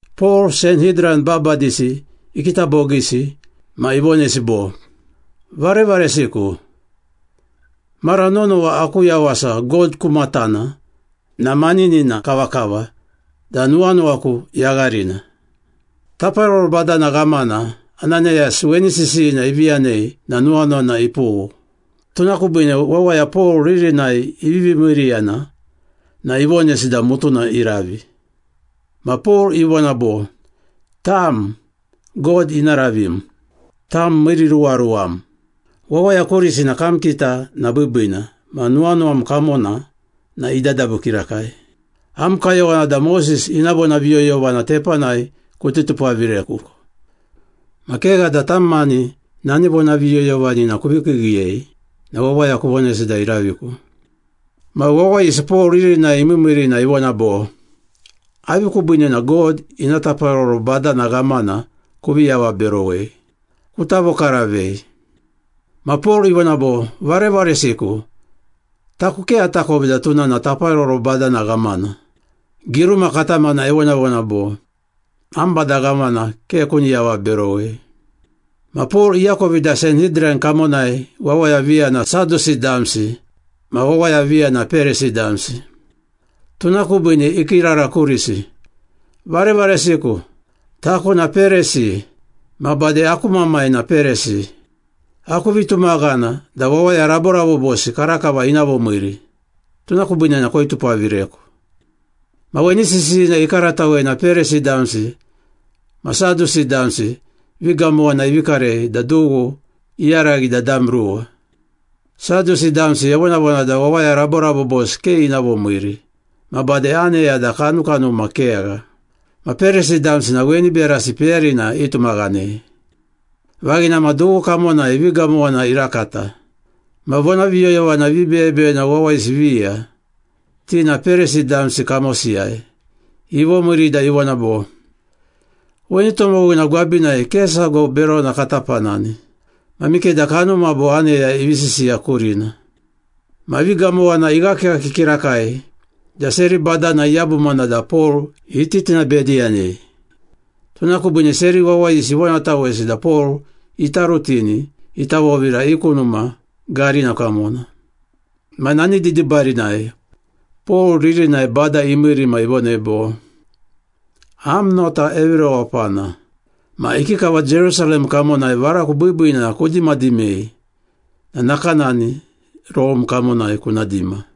Pol Sanhidran babadisi ikita bogiisi ma ivonesi bo, “Varevaresiku, mara nonowa aku yawasa God ku matana na maninina kavakava da nuwanuwaku yagharina.” Taparoro badana ghamana Ananayas weni sisiyina ivi yanei na nuwanuwana ipughu. Tuna kubiine wawaya Pol ririnai ivivi miiriyana na ivonesi da mutuna iravi. Ma Pol ivona bo, “Tam, God ina ravim! Tam miiriruwaruwam! Wawaya kurisi na kam kita na biibiina ma nuwanuwam kamona na idadabu kirakai! Am kayowana da Moses ina vonaviyoyovana tepanai kuti tupavireku, ma kegha da tam mani nani vonaviyoyovanina kuvi kiigiiyei na wawaya kuvonesi da iraviku!” Ma wawayisi Pol ririnai imiimiiri na ivona bo, “Avi kubiine na God ina taparoro badana ghamana kuvi avaberowei? Kuta vokaravei.” Ma Pol ivona bo, “Varevaresiku, taku ke atakovi da tuna na taparoro badana ghamana. Giruma katamana evonavona bo, ‘Am bada ghamana ke kuni avaberowei.’” Ma Pol iakovi da Sanhidran kamonai wawaya viya na Sadusi damsi ma wawaya viya na Perisi damsi. Tuna kubiine ikiirara kurisi, “Varevaresiku! Taku na Perisi ma bade aku mamai na Perisi. Aku vitumaghana da wawaya raborabobosi karakava ina vomiiri, tuna kubiine na koitupavireku!” Ma weni sisiyina ikaratawei na Perisi damsi ma Sadusi damsi vigamowana ivi karei da dughu iyaraghi da dam ruwa. Sadusi damsi evonavona da wawaya raborabobosi ke ina vomiiri ma bade aneya da kanukanuma kegha. Ma Perisi damsi na weni berasi peyarina itumaghanei. Vaghina ma dughu kamonai vigamowana irakata. Ma vonaviyoyovana vibeyebeyena wawayisi viya, ti na Perisi damsi kamosiyai, ivomiiri da ivona bo, “Weni tomowina gwabinai ke sago berona kata panani! Ma mikeda kanuma bo aneya ivi sisiya kurina.” Ma vigamowana ighakighaki kirakai da seri badana iyabumana da Pol iti tinabediyanei. Tuna kubiine seri wawayisi ivonatawesi da Pol ita rutini ita vovira i ku numa garina kamona. Ma nani didibarinai Pol ririnai Bada imiiri ma ivonei bo, “Am nota evi rewapana! Ma ikikava Jerusalem kamonai varaku biibiina kudimadimei na nakanani Rome kamonai kuna dima.”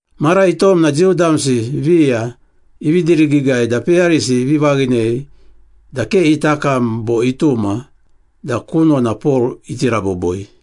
Mara itom na Jiu damsi viya ivi dirigiigai da peyarisi ivi vaghinei da ke ita kam bo ituma da kunona Pol iti raboboi.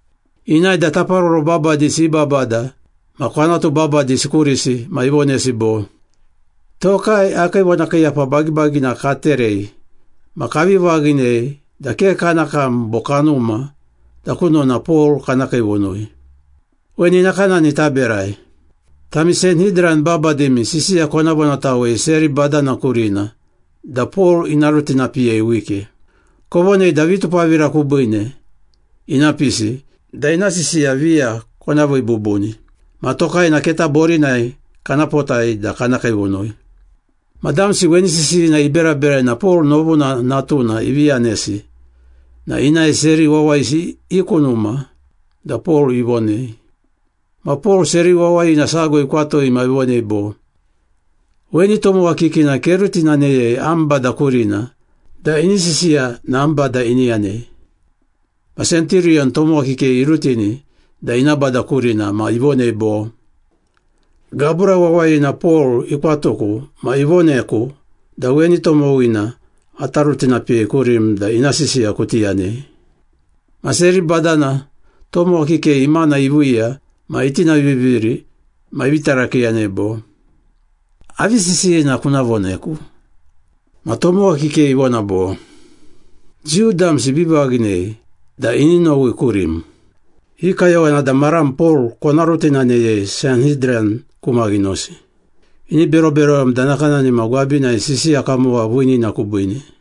Inae da taparoro babadisi i babada ma kwanatu babadisi kurisi ma ivonesi bo, “Tokai akii vonakiiyapa bagibagina katerei ma kavi vaghinei da ke kana kam bo kanuma da kunona Pol kana kiivunui. Weni nakanani taberai. Tami Sanhidran babadimi sisiya kona vonatawei seri badana kurina da Pol ina rutinapiyei wike. Kovonei da vitupavira kubiine ina pisi da ina sisiya viya kona vii bubuni. Ma tokai na keta borinai kana potai da kana kiivunui.” Ma damsi weni sisiyina iberaberai na Pol novuna natuna ivi yanesi na inae seri wawayisi i ku numa da Pol ivonei. Ma Pol seri wawaya sago ikwatui ma ivonei bo, “Weni tomowa kikina kerutinaneyei am bada kurina da ini sisiya na am bada ini yanei.” Ma senturiyon tomowa kikei irutini da ina bada kurina ma ivonei bo, “Gabura wawayina Pol ikwatuku ma ivoneku da weni tomowina ata rutinapiyei kurim da ina sisiya kuti yanei.” Ma seri badana tomowa kikei imana iviiya ma itinaviviri ma ivi tarakiiyanei bo, “Avi sisiyina kuna voneku?” Ma tomowa kikei ivona bo, “Jiu damsi ivi vaghinei da ini nowi kurim. I kayowana da maram Pol kona rutinaneyei Sanhidran ku maghinosi. Ini beroberowem da nakanani ma gwabinai sisiya kamowa viinina kubiine.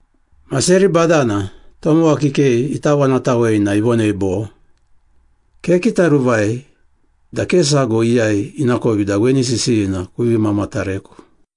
Ma seri badana tomowa kikei ita vonatawei na ivonei bo, “Kekitaruvai da ke sago iyai inakovi da weni sisiyina kuvi mamatareku.”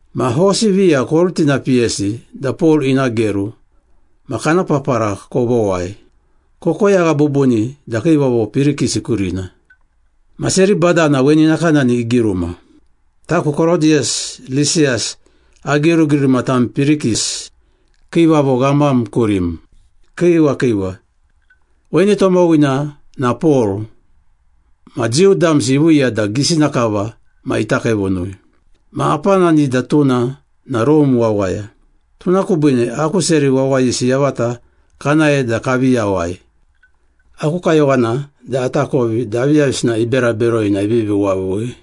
Ma hosi viya korutinapiyesi da Pol ina geru ma kana papara kovowai, kokoyagha bubuni da kiivavo Pirikis kurina.” Ma seri badana weni nakanani igiruma, “Taku Korodiyus Lisiyas agirugiruma tam Pirikis, kiivavo ghamam kurim. Kiiwa kiiwa. Weni tomowina na Pol, ma Jiu damsi iviiya da gisina kava ma ita kiivunui. Ma apanani da tuna na Rome wawaya, tuna kubiine aku seri wawayisi yavata kanae da kavi yawai. Aku kayowana da atakovi da aviyavisina ibera beroi na ivivi wavui.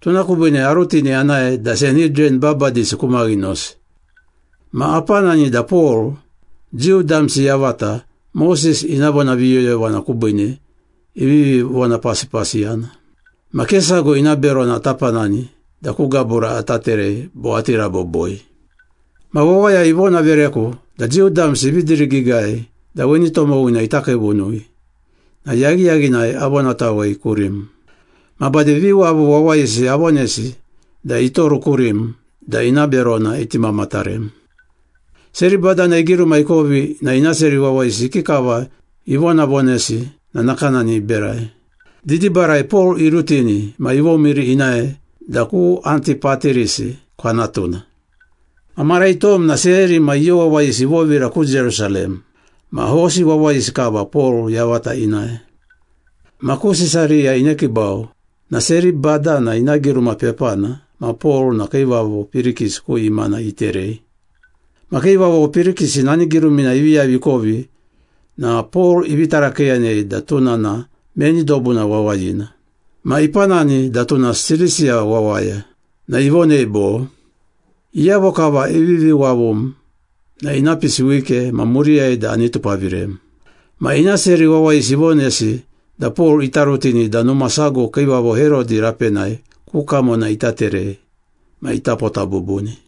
Tuna kubiine arutini anae da Sanhidran babadisi ku maghinosi. Ma apanani da Pol, Jiu damsi yavata Moses ina vonaviyoyovana kubiine ivivi vonapasipasiyana. Ma ke sago ina berona ata panani da ku gabura ata terei bo ati raboboi. Ma wawaya ivonavereku da Jiu damsi ivi dirigiigai da weni tomowina ita kiivunui na yaghiyaghinai avonatawei kurim. Ma bade viwavu wawayisi avonesi da itoru kurim da ina berona iti mamatarem.” Seri badana igiruma ikovi na ina seri wawayisi ikikava ivonavonesi na nakanani iberai. Didibarai Pol irutini ma ivomiiri inae da ku Antipatirisi kwanatuna. Ma mara itom na seri ma iyo wawayisi ivovira ku Jerusalem, ma hosi wawayisi kava Pol yavata inae. Ma ku Sisariya inekiibau na seri badana ina giruma pepana ma Pol na kiivavo Pirikis ku imana iterei. Ma kiivavo Pirikis nani girumina ivi yavi ikovi na Pol ivi tarakiiyanei da tuna na meni dobuna wawayina. Ma ipanani da tuna Silisiya wawaya, na ivonei bo, “Iyavo kava ivivi wavum na ina pisi wike ma muriyai da ani tupavirem.” Ma ina seri wawayisi ivonesi da Pol ita rutini da numa sago kiivavo Herodi rapenai ku kamona ita terei ma ita pota bubuni.